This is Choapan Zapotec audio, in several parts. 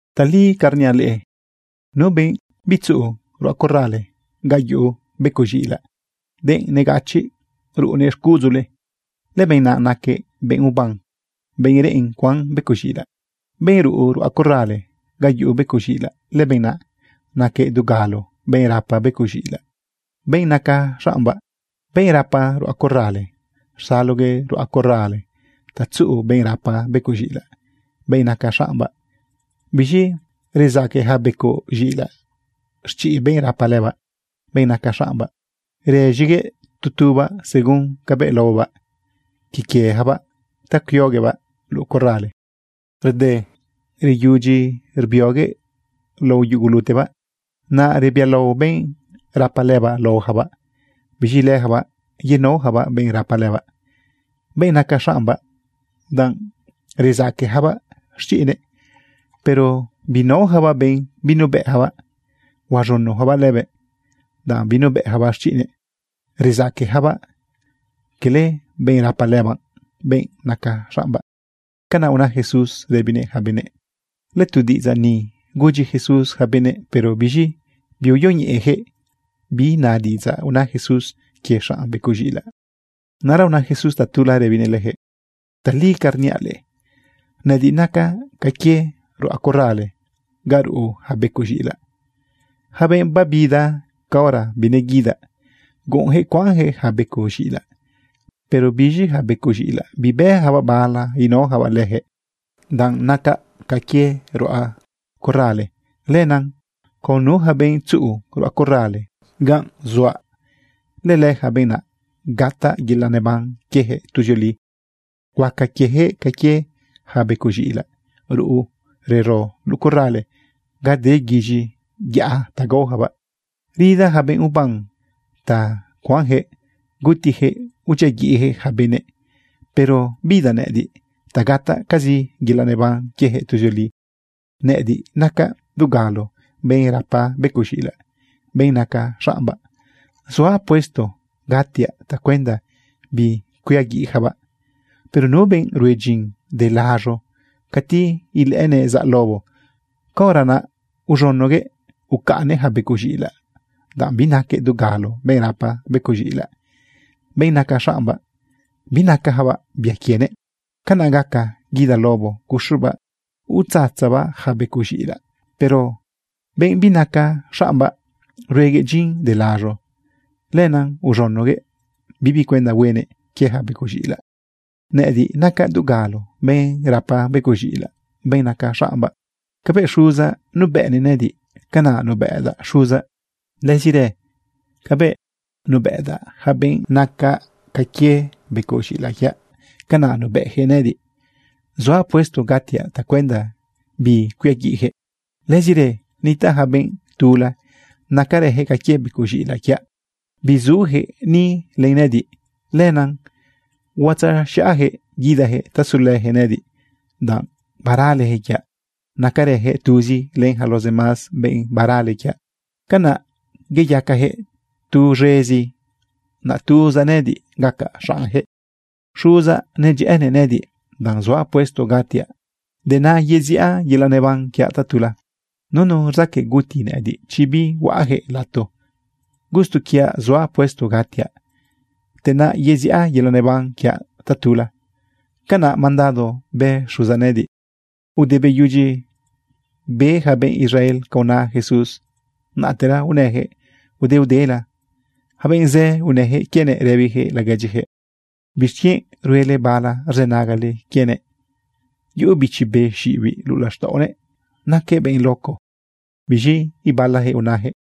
’Tali ca rniaꞌ leꞌe, nu benꞌ bitzuꞌu ruꞌa corrale ga yuꞌu becoꞌ z̃iꞌilaꞌ, denꞌ negachiꞌ ruꞌunëꞌ xcuꞌudzule, lëbenꞌ naꞌ naquëꞌ benꞌ uban, benꞌ reꞌen cuan becoꞌ z̃iꞌilaꞌ. Benꞌ ruꞌu ruꞌa corrale, ga yuꞌu becoꞌ z̃iꞌilaꞌ, lëbenꞌ naꞌ naquëꞌ dugalo benꞌ rapa becoꞌ z̃iꞌilaꞌ, benꞌ naca xaꞌmbaꞌ. Benꞌ rapa ruꞌa corrale, rsaloguëꞌ ruꞌa corrale ta tzuꞌu benꞌ rapa becoꞌ z̃iꞌilaꞌ, benꞌ naca xaꞌmbaꞌ. Biz̃i rezaque yaca becoꞌ z̃iꞌilaꞌ xchiꞌ benꞌ rapa lëbaꞌ, benꞌ naca xaꞌmbaꞌ. Rëz̃iguëꞌ tu tubaꞌ según cabëꞌ laobaꞌ quie quiejabaꞌ ta cuioguëꞌbaꞌ luꞌu corrale. Rde reyudyi rbioguëꞌ lao yugulutebaꞌ, naꞌ rebialao benꞌ rapa lëbaꞌ laoyacabaꞌ. Biz̃i leyacabaꞌ yenaoyacabaꞌ benꞌ rapa lëbaꞌ, benꞌ naca xaꞌmbaꞌ danꞌ rezaqueyacabaꞌ xchiꞌnëꞌ. Pero binaoyacabaꞌ benꞌ binubëꞌyacabaꞌ. Huaz̃unoyacabaꞌ lëbëꞌ, danꞌ binubëꞌyacabaꞌ xchiꞌnëꞌ. Rezaqueyacabaꞌ cala benꞌ rapa lëbaꞌ, benꞌ naca xaꞌmbaꞌ. ―Canaꞌ una Jesús rëbinëꞌ yaca benëꞌ. Lëtu diꞌidzaꞌ ni gudyi Jesús yaca benëꞌ, pero biz̃i biuyoñeꞌejëꞌ bi na diꞌidzaꞌ una Jesús quie xaꞌn becoꞌ z̃iꞌilaꞌ. Naꞌra una Jesús tatula rëbinëꞌ leyaquëꞌ: ―Tali ca rniaꞌ leꞌe, nëꞌëdiꞌ nacaꞌ ca quie ruꞌa corrale ga ruꞌu yaca becoꞌ z̃iꞌilaꞌ. Yaca benꞌ babida caora bineguidaꞌ, guꞌunyaquëꞌ cuanyaquëꞌ yaca becoꞌ z̃iꞌilaꞌ. Pero biz̃i yaca becoꞌ z̃iꞌilaꞌ bibëyacabaꞌ bala inaoyacabaꞌ leyaquëꞌ. Danꞌ nacaꞌ ca quie ruꞌa corrale, lenaꞌ con nu yaca benꞌ tzuꞌu ruꞌa corrale ganꞌ zuaꞌ, lëlëyaca benꞌ naꞌ gataꞌ yelaꞌ neban quiejëꞌ tuzioli. Huaca quieyaquëꞌ ca quie yaca becoꞌ z̃iꞌilaꞌ ruꞌu rero luꞌu corrale ga de guiz̃i yaꞌa ta gaoyacabaꞌ. ’Rida yaca benꞌ uban ta cuanyaquëꞌ gutiyaquëꞌ udyiaguiꞌyaquëꞌ yaca benëꞌ. Pero bidaꞌ nëꞌëdiꞌ ta gataꞌcazi yelaꞌ neban quieyaquëꞌ tuzioli. Nëꞌëdiꞌ nacaꞌ dugalo benꞌ rapa becoꞌ z̃iꞌilaꞌ, benꞌ naca xaꞌmbaꞌ. Zuaꞌ puesto gatiaꞌ tacuenda bicuiaguiꞌyacabaꞌ. Pero nu benꞌ rue dyin de laz̃o, cati ilëꞌënëꞌ zaꞌ lobo, caora naꞌ iz̃unoguëꞌ ucaꞌnnëꞌ yaca becoꞌ z̃iꞌilaꞌ, danꞌ binaquëꞌ dugalo benꞌ rapa becoꞌ z̃iꞌilaꞌ, benꞌ naca xaꞌmbaꞌ. Binacayacabaꞌ bia quienëꞌ. Canaꞌ gaca guida lobo guxubaꞌ utzatzabaꞌ yaca becoꞌ z̃iꞌilaꞌ. Pero benꞌ binaca xaꞌmbaꞌ rueguëꞌ dyin de laz̃o, lenaꞌ uz̃unoguëꞌ bibi cuenda huenëꞌ quie yaca becoꞌ z̃iꞌilaꞌ. ’Nëꞌëdiꞌ nacaꞌ dugalo benꞌ rapa becoꞌ z̃iꞌilaꞌ, benꞌ naca xaꞌmbaꞌ. Cabëꞌ Xuzaꞌ nubëꞌnëꞌ nëꞌëdiꞌ, canaꞌ nubëꞌdaꞌ Xuzaꞌ. Lëzirë cabëꞌ nubëꞌdaꞌ yaca benꞌ naca ca quie becoꞌ z̃iꞌilaꞌ quiaꞌ, canaꞌ nubëꞌyaquëꞌ nëꞌëdiꞌ. Zuaꞌ puesto gatiaꞌ tacuenda bicuiaguiꞌyaquëꞌ. Lëzirë nitaꞌ yaca benꞌ tula nacarëyaquëꞌ ca quie becoꞌ z̃iꞌilaꞌ quiaꞌ. Bizuyaquëꞌ ni len nëꞌëdiꞌ. Lenaꞌ huatzaz̃iꞌayaquëꞌ guidayaquëꞌ ta sulëyaquëꞌ nëꞌëdiꞌ, danꞌ baraleyaquëꞌ quiaꞌ. Nacarëyaquëꞌ tuzi len yaca los demás benꞌ barale quiaꞌ. Canaꞌ iyacayaquëꞌ tu z̃ezi, naꞌ tuzaꞌ nëꞌëdiꞌ gacaꞌ xaꞌnyaquëꞌ. ’Xuzaꞌ nedyëꞌënëꞌ nëꞌëdiꞌ danꞌ zuaꞌ puesto gatiaꞌ, te naꞌ yeziꞌa yelaꞌ neban quiaꞌ tatula. ’Nunu rzaqueꞌ guti nëꞌëdiꞌ chi bihuaꞌyaquëꞌ lato. Gusto quiaꞌ zuaꞌ puesto gatiaꞌ, te naꞌ yeziꞌa yelaꞌ neban quiaꞌ tatula. Canaꞌ mandado bë Xuzaꞌ nëꞌëdiꞌ. Ude beyudyi be yaca benꞌ Israel ca una Jesús, naꞌtera unëyaquëꞌ udeudela. Yaca benꞌ zë unëyaquëꞌ quienëꞌ rëbiyaquëꞌ laguedyiyaquëꞌ: ―¿Bixquienꞌ ruele bala rzënagale quienëꞌ? Yuꞌu bichi be xiꞌibiꞌ luꞌu laxtaꞌonëꞌ, naquëꞌ benꞌ loco. Biz̃i ibalayaquëꞌ unayaquëꞌ: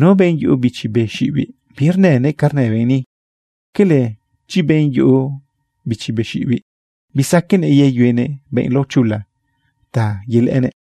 ―Nu benꞌ yuꞌu bichi be xiꞌibiꞌ, birnënëꞌ ca rnë benꞌ ni. ¿Quele, chi benꞌ yuꞌu bichi be xiꞌibiꞌ, bisaqueꞌnëꞌ yeyuenëꞌ benꞌ laochula ta yelëꞌënëꞌ?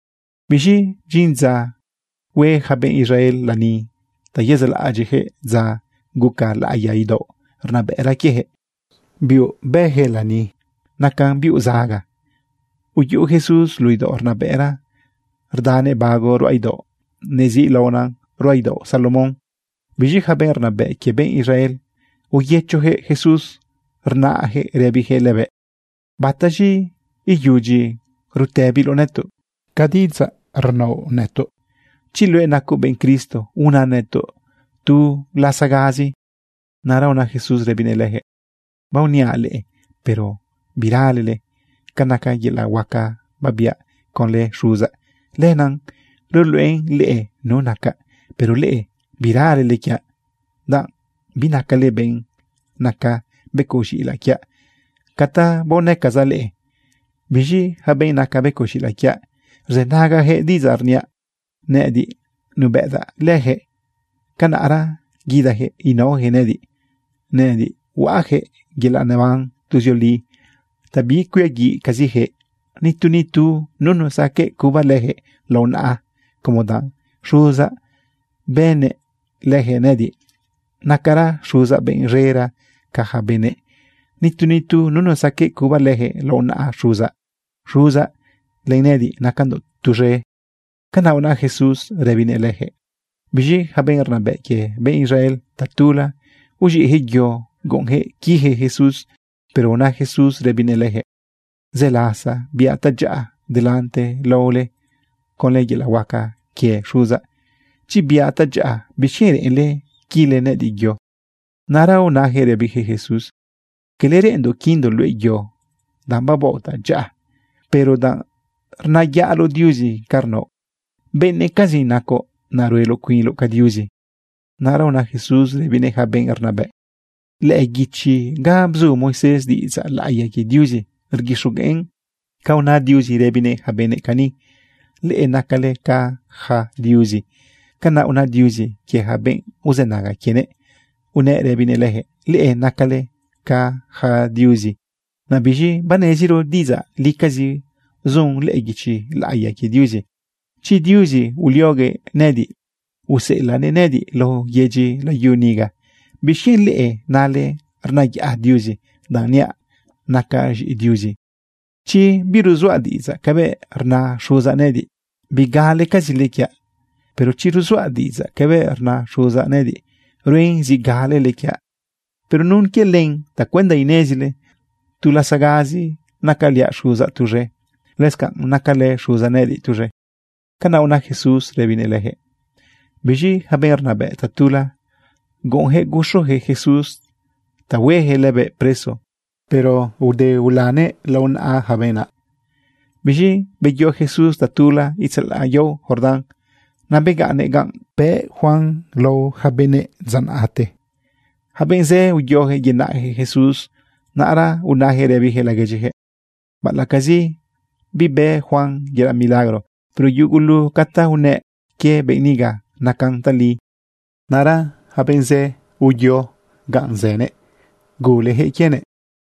Biz̃i bdyin dza hue yaca benꞌ Israel lani ta yezaꞌlaꞌadyiꞌyaquëꞌ dza guca laꞌiya idaoꞌ rnabëꞌra quieyaquëꞌ. Biuꞌ bëyaquëꞌ lani, nacan biuꞌ zaga. Uyuꞌu Jesús luꞌu idaoꞌ rnabëꞌra rdanëꞌ bago ruꞌa idaoꞌ neziꞌlaonan ruꞌa idaoꞌ Salomón. Biz̃i yaca benꞌ rnabëꞌ quie benꞌ Israel uyëchoyaquëꞌ Jesús rnayaquëꞌ rëbiyaquëꞌ lëbëꞌ: ―¿Bataz̃i iyudyi rutëbiloꞌ nëtoꞌ ca diꞌidzaꞌ inaoꞌ nëtoꞌ? Chi luëꞌ nacoꞌ benꞌ Cristo, una nëtoꞌ tu lasagazi. Naꞌra una Jesús rëbinëꞌ leyaquëꞌ: ―Baoniaꞌ leꞌe, pero biralele. Ca naca yelaꞌ huaca babiaꞌ conlë Xuzaꞌ, lenaꞌ ruluꞌenan leꞌe nu nacaꞌ. Pero leꞌe biralele quiaꞌ, danꞌ binacale benꞌ naca becoꞌ z̃iꞌilaꞌ quiaꞌ ca ta baonëcazaꞌ leꞌe. Biz̃i yaca benꞌ naca becoꞌ z̃iꞌilaꞌ quiaꞌ, rzënagayaquëꞌ diꞌidzaꞌ rniaꞌ. Nëꞌëdiꞌ nubëꞌdaꞌ leyaquëꞌ, canaꞌra guidayaquëꞌ inaoyaquëꞌ nëꞌëdiꞌ. Nëꞌëdiꞌ huaꞌyaquëꞌ yelaꞌ neban tuzioli ta bicuiaguiꞌcaziyaquëꞌ. Nitu nitu nunu saqueꞌ cuba leyaquëꞌ lao naꞌa como danꞌ Xuzaꞌ bënnëꞌ leyaquëꞌ nëꞌëdiꞌ. Nacara Xuzaꞌ benꞌ z̃era ca yaca benëꞌ. Nitu nitu nunu saqueꞌ cuba leyaquëꞌ lao naꞌa Xuzaꞌ. Xuzaꞌ len nëꞌëdiꞌ nacandoꞌ tuz̃e. ―Canaꞌ una Jesús rëbinëꞌ leyaquëꞌ. Biz̃i yaca benꞌ rnabëꞌ quie benꞌ Israel, tatula uz̃iꞌyaquëꞌ yo, guꞌunyaquëꞌ quiyaquëꞌ Jesús. Pero una Jesús rëbinëꞌ leyaquëꞌ: ―Zë lasa biaꞌ tadyaꞌa delante lao leꞌe conlë yelaꞌ huaca quie Xuzaꞌ. Chi biaꞌ tadyaꞌa, ¿bixquienꞌ reꞌenle quile nëꞌëdiꞌ yo? Naꞌra unayaquëꞌ rëbiyaquëꞌ Jesús: ―Cala reꞌenndoꞌ quindoꞌ luëꞌ yo danꞌ babaoꞌ tadyaꞌa, pero danꞌ rnayaꞌloꞌ Diuzi ca rnaoꞌ. Benëꞌcazi nacoꞌ, naꞌ rueloꞌ cuinloꞌ ca Diuzi. Naꞌra una Jesús rëbinëꞌ yaca benꞌ rnabëꞌ: ―Lëꞌë guichi ga bzu Moisés diꞌidzaꞌ laꞌiya quie Diuzi, rguixogueꞌn ca una Diuzi rëbinëꞌ yaca benëꞌ cani: “Leꞌe nacale ca yaca diuzi.” Canaꞌ una Diuzi quie yaca benꞌ uzënaga quienëꞌ unëꞌ rëbinëꞌ leyaquëꞌ: “Leꞌe nacale ca yaca diuzi.” Naꞌ biz̃i baneziro diꞌidzaꞌ licazi zun lëꞌë guichi laꞌiya quie Diuzi. Chi Diuzi ulioguëꞌ nëꞌëdiꞌ useꞌelaꞌnëꞌ nëꞌëdiꞌ lao yedyi layu niga, ¿bixquienꞌ leꞌe nale rnayaꞌ Diuzi danꞌ niaꞌ nacaꞌ z̃iꞌi Diuzi? Chi birzuaꞌ diꞌidzaꞌ cabëꞌ rna Xuzaꞌ nëꞌëdiꞌ, bigalecazile quiaꞌ. Pero chi rzuaꞌ diꞌidzaꞌ cabëꞌ rna Xuzaꞌ nëꞌëdiꞌ, ruen zi galele quiaꞌ por nun quie len tacuenda inezile tu lasagazi nacaliaꞌ Xuzaꞌ tuz̃e, lëscanꞌ nacalë Xuzaꞌ nëꞌëdiꞌ tuz̃e. ―Canaꞌ una Jesús rëbinëꞌ leyaquëꞌ. Biz̃i yaca benꞌ rnabëꞌ, tatula guꞌunyaquëꞌ guxuyaquëꞌ Jesús ta hueyaquëꞌ lëbëꞌ preso, pero aode ulanëꞌ lao naꞌa yaca benꞌ naꞌ. Biz̃i beyo Jesús tatula itzalaꞌ yao Jordán. Naꞌ begaꞌnnëꞌ ganꞌ bëꞌ Juan lao yaca benëꞌ dza naꞌte. Yaca benꞌ zë uyoyaquëꞌ yenaꞌyaquëꞌ Jesús. Naꞌra unayaquëꞌ rëbiyaquëꞌ laguedyiyaquëꞌ: ―Baꞌalaꞌcazi bibë Juan yelaꞌ milagro, pero yugulu ca ta unëꞌ quie benꞌ niga nacan tali. Naꞌra yaca benꞌ zë uyo ganꞌ zënëꞌ, guleyaquëꞌ quienëꞌ.